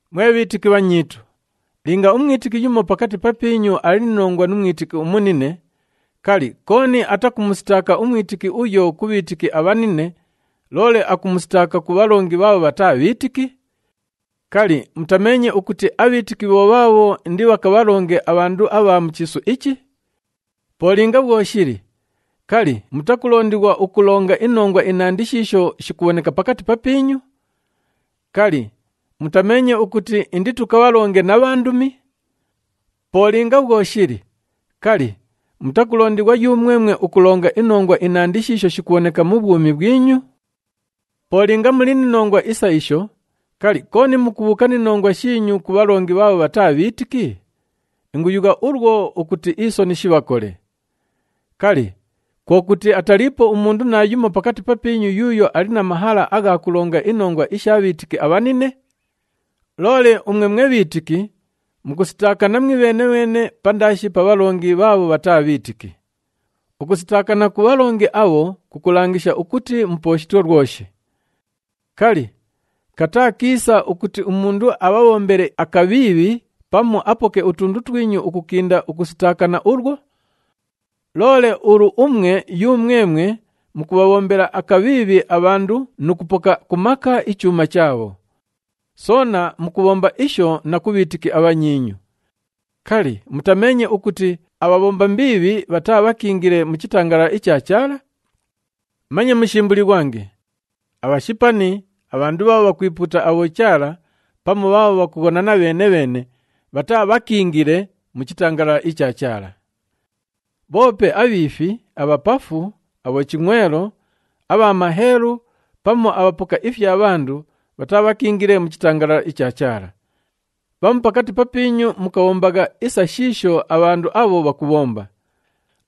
Mwe bhiitiki abhanyiitu, linga umwitiki yumo pakati papiinyu ali ni nongwa nu mwitiki umunine, kali, kooni atakumusitaaka umwitiki uyo ku bhiitiki abhanine, loole akumusitaaka ku bhalongi bhaabho bhataa bhiitiki? Kali, mutameenye ukuti abhiitiki bho bhaabho indibhakabhalonge abhandu abha mu chiisu ichi? Po linga bhwo shili, kali, mutakulondighwa ukulonga inongwa inandi shiisho shikubhoneka pakati papiinyu? Kali, mutameenye ukuti inditukabhalonge na bhandumi? Po linga bhwo shili, kali, mutakulondighwa yumwemwe ukulonga inongwa inandi shiisho shikubhoneka mu bhwumi bhwinyu? Po linga muli ni nongwa isa isho, kali, kooni mukubhuuka ni nongwa shiinyu ku bhalongi bhaabho bhataa bhiitiki? Inguyugha ulwo ukuti isoni shibhakole. Kali, kwo kuti ataliipo umundu naayumo pakati papiinyu yuuyo ali na mahala agha kulonga inongwa isha bhiitiki abhanine? Loole umwe mwe bhiitiki, mukusitaakana mwibheene-bheene pandaashi pa bhalongi bhaabho bhataa bhiitiki! Ukusitaakana ku bhalongi abho kukulangisha ukuti mupooshitwe lwoshi. Kali, kataa kiisa ukuti umundu abhabhombele akabhiibhi pamu apoke utundu twinyu ukukinda ukusitaakana ulwo? Loole ulu umwe yumwemwe mukubhabhombela akabhiibhi abhandu nu kupoka ku maka ichuuma chaabho. Soona mukubhomba isho na ku bhiitiki abhanyiinyu! Kali, mutameenye ukuti abhabhomba mbiibhi bhataabhakiingile mu chitangalala icha Chaala? Manye mushimbulighwange! Abhashipani, abhandu bhaabho bhakwipuuta abhochaala pamu bhaabho bhakughonana bheene-bheene bhataabhakiingile mu chitangalala icha Chaala. Bhoope abhiifi, abhapafu, abhochingʼwelo, abha maheelu pamu abhapoka ifya bhandu bhataabhakiingile mu chitangalala icha Chaala. Bhamu pakati papiinyu mukabhombagha isa shiisho abhandu abho bhakubhomba.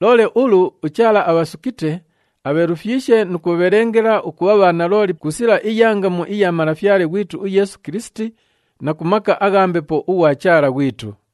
Loole ulu, uChaala abhasukite, abheelufyishe nu kubhabhelengela ukubha bhanalooli ku sila iya ngamu iya Malafyale ghwitu uYeesu Kilisiti na ku maka agha Mbepo ughwa Chaala ghwitu.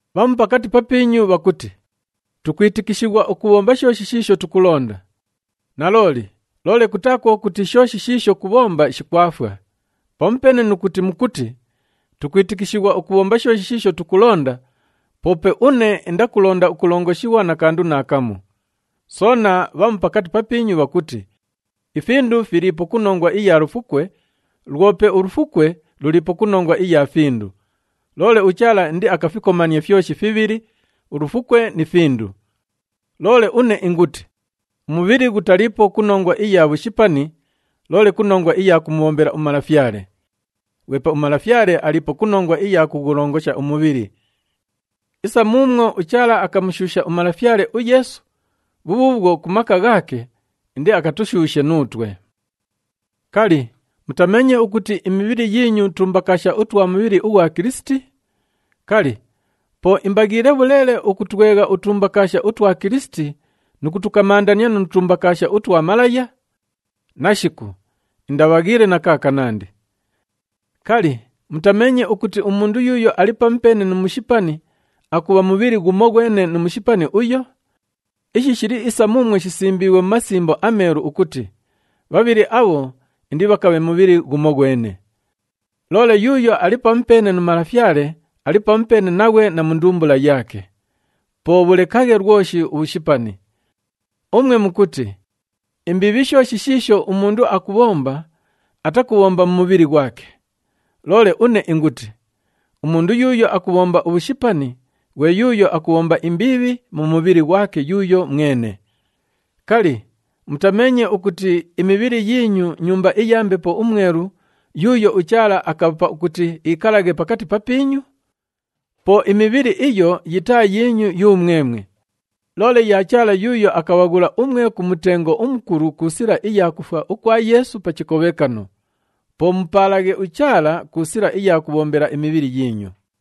Bhamu pakati papiinyu bhakuti, “Tukwitikishighwa ukubhomba shooshi shiisho tukulonda.” Nalooli, loole kutaa kwo kuti shooshi shiisho kubhomba shikwafwa. Pamupeene nu kuti mukuti, “Tukwitikishighwa ukubhomba shooshi shiisho tukulonda,” poope une indakulonda ukulongoshighwa na kandu naakamu. Soona bhamu pakati papiinyu bhakuti, “Ifindu filiipo ku nongwa iya lufukwe, lwope ulufukwe luliipo ku nongwa iya findu, loole uChaala indiakafikomanie fyoshi fibhili, ulufukwe ni findu.” Loole une inguti, umubhili ghutaliipo ku nongwa iya bhushipani, loole ku nongwa iya kumubhombela uMalafyale. Ghwepe uMalafyale aliipo ku nongwa iya kughulongosha umubhili. Isa muumwo uChaala akamushuusha uMalafyale uYeesu, bhubhuubhwo ku maka ghaake indiakatushuushe nuutwe. Kali, mutameenye ukuti imibhili yiinyu tumbakaasha utwa mubhili ughwa Kilisiti? Kali, po imbaghiile bhuleele ukutwegha utumbakaasha utwa Kilisiti nu kutukamandania nu tumbakaasha utwa malaya? Nashiku, indabhaghiile na kaakanandi! Kali, mutameenye ukuti umundu yuuyo ali pamupeene nu mushipani akubha mubhili ghumoghwene nu mushipani uyo? Ishi shili isa muumwo shisimbiighwe mu Masimbo aMeelu ukuti, “Bhabhili abho indibhakabhe mubhili ghumoghwene.” Loole yuuyo ali pamupeene nu Malafyale ali pamupeene naghwe na mu ndumbula yaake. Po bhulekaghe lwoshi ubhushipani. Umwe mukuti, “Imbiibhi shooshi shiisho umundu akubhomba, atakubhomba mu mubhili ghwake.” Loole une inguti, umundu yuuyo akubhomba ubhushipani, ghwe yuuyo akubhomba imbiibhi mu mibhili ghwake yuuyo mwene. Kali, mutameenye ukuti imibhili yiinyu nyumba iya Mbepo uMwelu yuuyo uChaala akabhapa ukuti iikalaghe pakati papiinyu? Po imibhili iyo yitaa yiinyu yumwemwe, loole ya Chaala yuuyo akabhaghula umwe ku mutengo umukulu ku sila iya kufwa ukwa Yeesu pa chikobhekano. Po mupaalaghe uChaala ku sila iya kubhombela imibhili yiinyu.